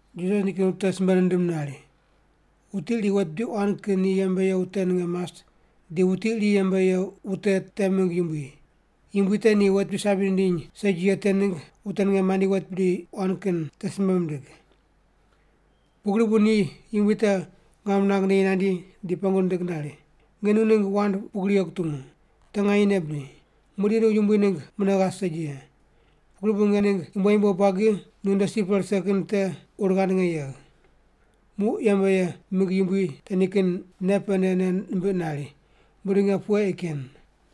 Jisas nikin wute simbe nindim nari, “Wuti iri wet bidi quan kin ni yembe ye wute ninge mas di wuti iri yembe ye wute te mingg yumbui. Yumbui te ni wet bidi sabi nindiny segi ye te ningg wute ninge mandi wuti wet bidi quan kin te simbe mindig. Pugri bu ni yumbui te ngam nirang neyi nandi di pengu nindig nari, ‘Nge nu ningg wand pugri ye kutungu. Te nganyene bri? Muqdi nu yumbui ningg mune ghas segi ye, pugri bu nge ningg yumbo yumbo buagi nunde si pe rise ye te kin ur ghand nge yegh.’ “Muq yembe ye mingg yumbui te nikin nei pene nei nimbiq nari, ‘Muqdi nge pughe ei ken?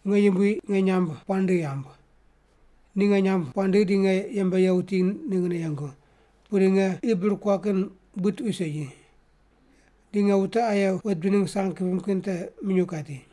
Nge yumbui nge nyamb puaq nindigh yamb. Ni nge nyamb puaq nindigh di nge yembe ye wuti ninggne yengu, pudi nge qi bir kuaq kin buid tuqui segi. Di nge wute aye wet bidi ningg sang kipim kin te minyuw kati.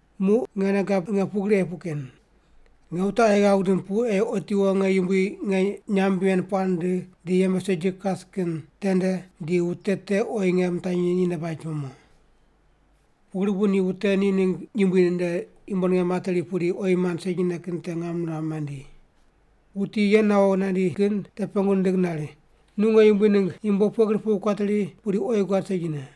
Muq nge nei gab nge pugri ei puq ken. Nge wute aye ghav gidim pu ei otiwo nge yumbui nge nyamb ven puaq nindigh di yembe segi kas kin tende di wute te oyi nge mitanyi ni nde baj pe mo.’ “Pugri bu ni wute ni ningg yumbui nde yumbo ninge materi pudi oyi mand segine kin te ngam niram mandi. Wuti ye nawo nandi kin te pengu nindig nari, ‘Nu nge yumbui ningg yumbo pughe gri pu kuateri pudi oyi guad segine?’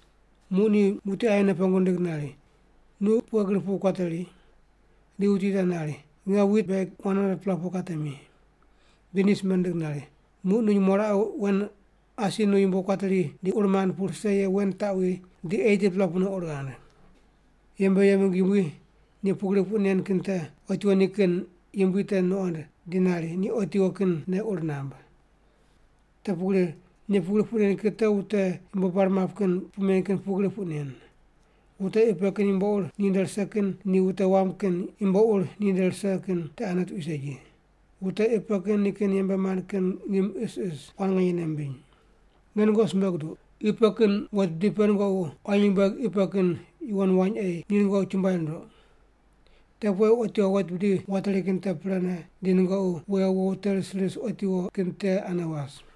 “Muq ni wuti aye mune pengu nindig nari, ‘Nu pughe gri pu kuateri?’ Di wuti te nari, ‘Nge wit bek 100-pela pu katemi.’ Di ni simbe nindig nari, ‘Muq nu nyumo raqe wen asi nu yumbo kuateri di ur mand pu rise ye wen taqwi, di 80-pela pune ur ghand.’ “Yembe ye mingg yumbui ni pugri puq nen kin te otiwo nikin yumbui te nuqond di nari ni otiwo kin nei ur namb. Te pugri ni pugri puq nen kin te wute yumbo bar map kin puq men kin pugri puq nen. Wute qi pe kin yumbo ur ni nde rise kin ni wute wam kin yumbo ur ni nde rise kin te ane tuqui segi. Wute qi pe kin nikin yembe mand kin ngim isis quan nganye nei mimbiny. Nge nungoqi simbe guduq, qi pe kin wet bidi pe nungoqi quayi nyumbueg qi pe kin yuwon wany ei ni nungoqi chumbuai runduq. Te pu ei otiwo wet bidi wateri kin te prene, di nungoqi wewo wo wute ris ris otiwo kin te ane was.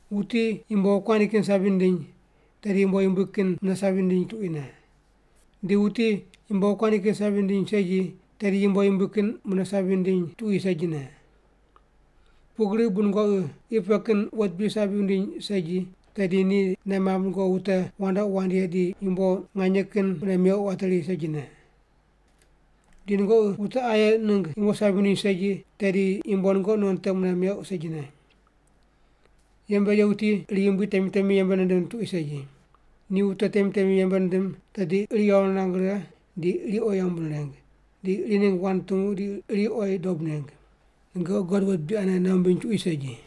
“Wuti yumbo wokuandi kin sabi nindiny, tedi yumbo yumbui kin mune sabi nindiny tuquine. Di wuti yumbo wokuandi kin sabi nindiny segi, tedi yumbo yumbui kin mune sabi nindiny tuqui segine. Pugri bu nungoqi qi pe kin wet bidi sabi wundiny segi, tedi ni nei mamb nungoqi wute wandoqi wand ye di yumbo nganye kin mune meuq wateri segine. Di nungoqi wute aye ningg yumbo sabi wundiny segi, tedi yumbo nungoqi non te te mune meuq segine. Yembe ye wuti iri yumbui temi temi yembe nindim tuqui segi. Ni wute temi temi yembe nindim tedi iri yawo nirang righe di iri oyi yambu nireng, di iri ningg wand nutungu di iri oyi dob neng. Nungoqi God wet bidi anene nei wumbiny tuqui segi.”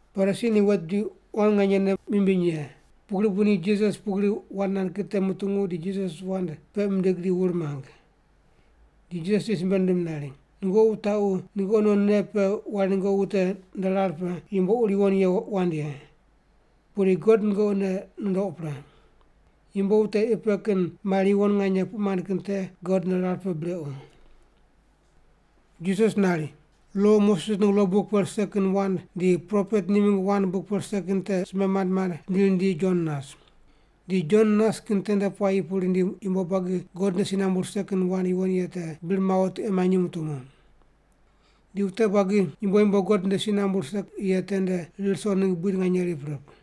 Parisi ni wet bidi quan nganye nei mimbiny ye, pugri bu ni Jisas pugri wand nand kin te mutungu di Jisas wand peq mindig di wur mang. Di Jisas ni simbe nindim nari, “Nungoqi wutaqu nungoqi non nei pe wari nungoqi wute nde rar pe yumbo ur yuwon ye wand ye. Pudi God nungoqi nei nundouq pre. Yumbo wute qi pe kin mari yuwon nganye puq mand kin te God nde rar pe brequ.” Jisas nari, “Lo Moses ningg lo buk pe rise kin wand di propet ni mingg wand buk pe rise kin te simbe mand mand rindi rindi Jon nas. Di Jon nas kin tende puayi pu rindi yumbo buagi God nde si nambu rise kin wand yuwon ye te bir mawo tiqe manyi mutungu. Di wute buagi yumbo yumbo God nde si nambu rise ye tende rir ruso ningg buid nganye rip rip.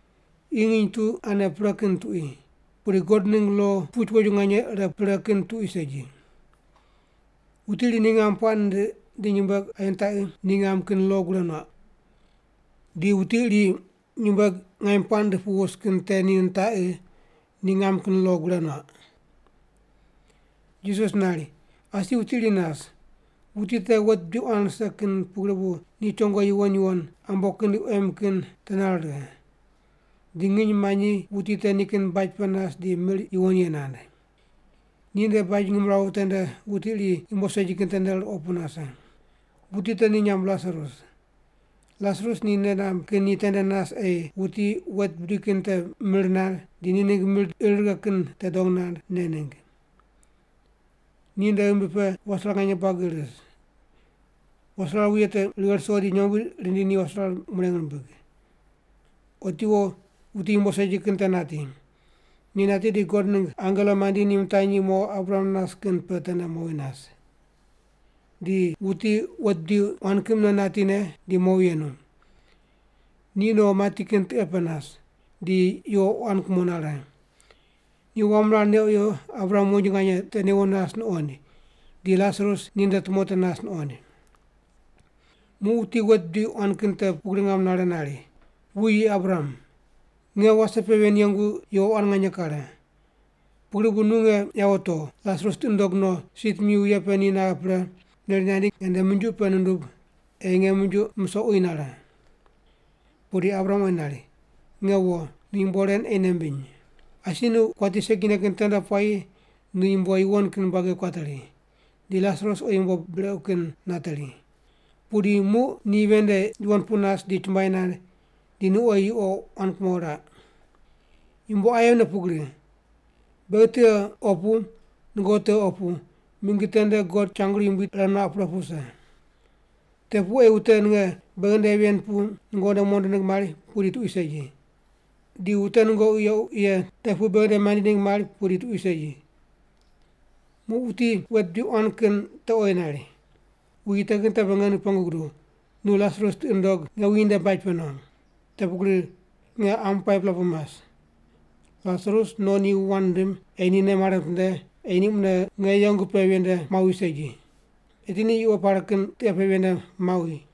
Qi nginy tu ane pre kin tuqui, pudi God ningg lo puch woju nganye ire pre kin tuqui segi. “Wuti iri ni ngam puaq nindiq di nyumbueg aye nitaqi ni ngam kin lo gure nuaq. Di wuti iri nyumbueg ngaim puaq nindiq pu wus kin te ni nitaqi, ni ngam kin lo gure nuaq.” Jisas nari, “Asi wuti iri nas. Wuti te wet bidi quan rise kin pugri bu ni chongo yuwon yuwon, ambo kin di quem kin te nare righe. Di nginy manyi wuti te nikin baj pe nas di mir yuwon ye nand. Ni nde baj ngimrawu tende wuti iri yumbo segi kin tende ruqo pu nase. Wuti te ni nyamb Lasarus. Lasarus ni nei namb kin ni tende nas ei wuti wet bidi kin te mir nand di ni ningg mir di ir righe kin te dong nand, ne ningg. Ni nde ghimbi pe waserar nganye buagi ris. Waserar wuye te righe ruso di nyombui rindi ni waserar mureng rimbig. “Otiwo wuti yumbo segi kin te nati. Ni nati di God ningg angelo mandi ni mitanyi mo Abraham nas kin pe tende mowi nas. Di wuti wet bidi quan kin mune natine di mowi yenu. Ni no mati kin tiqe pe nas, di yuqo quan kumo nare. Ni wam rar neq wiyo Abraham wonji nganye te newo nas nuqoind, di Lasarus ni nde tumo te nas nuqoind. Muq wuti wet bidi quan kin te pugri ngam nare nari, ‘Wuyi, Abraham. Nge wase pe ven yengu yuqo quan nganye kare. Pugri bu nu nge yawo togh, Lasarus tiqi ndog no, si timi wuye pe ni naghe pre, neri nandi nge nde minjuq pe nundub ei nge minjuq musoq uyi nare.’ “Pudi Abraham oyi nari, ‘Nge wo, nu yumbo ren ei nei mbiny. Asi nu kuati segine kin tende puayi nu yumbo yuwon kin buagi kuateri, di Lasarus oyi yumbo brequ kin nateri. Pudi muq ni ven nde yuwon pu nas di chumbuai nand, di nu oyi yuqo quan kumo raq. Yumbo aye mune pugri. Beghi tiqe opu nungoqi tiqe opu, mingi tende God changru yumbui ire nuaq pre pu wuse. Te pu ei wute ninge beghi nde ven pu nungoqi nde mondo ningg mari, pudi tuqui segi. Di wute nungoqi yequ ye te pu beghi nde mandi ningg mari, pudi tuqui segi.’ “Muq wuti wet bidi quan kin te oyi nari, ‘Wuyi, te kin te be nge nu pengu guduw, nu Lasarus tiqi ndog nge wuyi nde baj pe no. Te pugri nge qam 5-pela pu mas. Lasarus no ni wu wand nindim ei ni nei mare mitinde ei ni mune nge yengu ye pe ven nde mawi segi. Eti ni yuqo pare kin tiqe pe ven nde mawi.’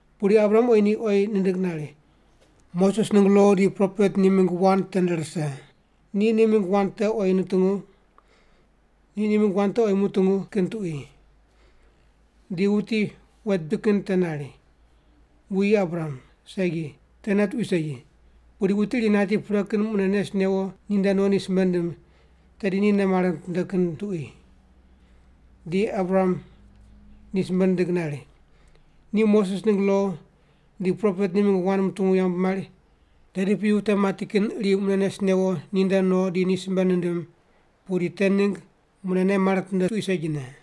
“Pudi Abraham oyi ni oyi nindig nari, ‘Moses ningg lo di propet ni mingg wand tende rise. Ni ni mingg wand te oyi mutungu kin tuqui.’ Di wuti wet bidi kin te nari, ‘Wuyi Abraham, segi. Tene tuqui segi. Pudi wuti iri nati pre kin mune nes newo ni nde no ni simbe nindim, tedi ni nei mare mitinde kin tuqui.’ “Di Abraham ni simbe nindig nari, ‘Ni Moses ningg lo di propet ni mingg wand mutungu yambu mari, tedi piyi wute mati kin iri mune nes newo ni nde no di ni simbe nindim, pudi te ningg mune nei mare mitinde tuqui segine’.”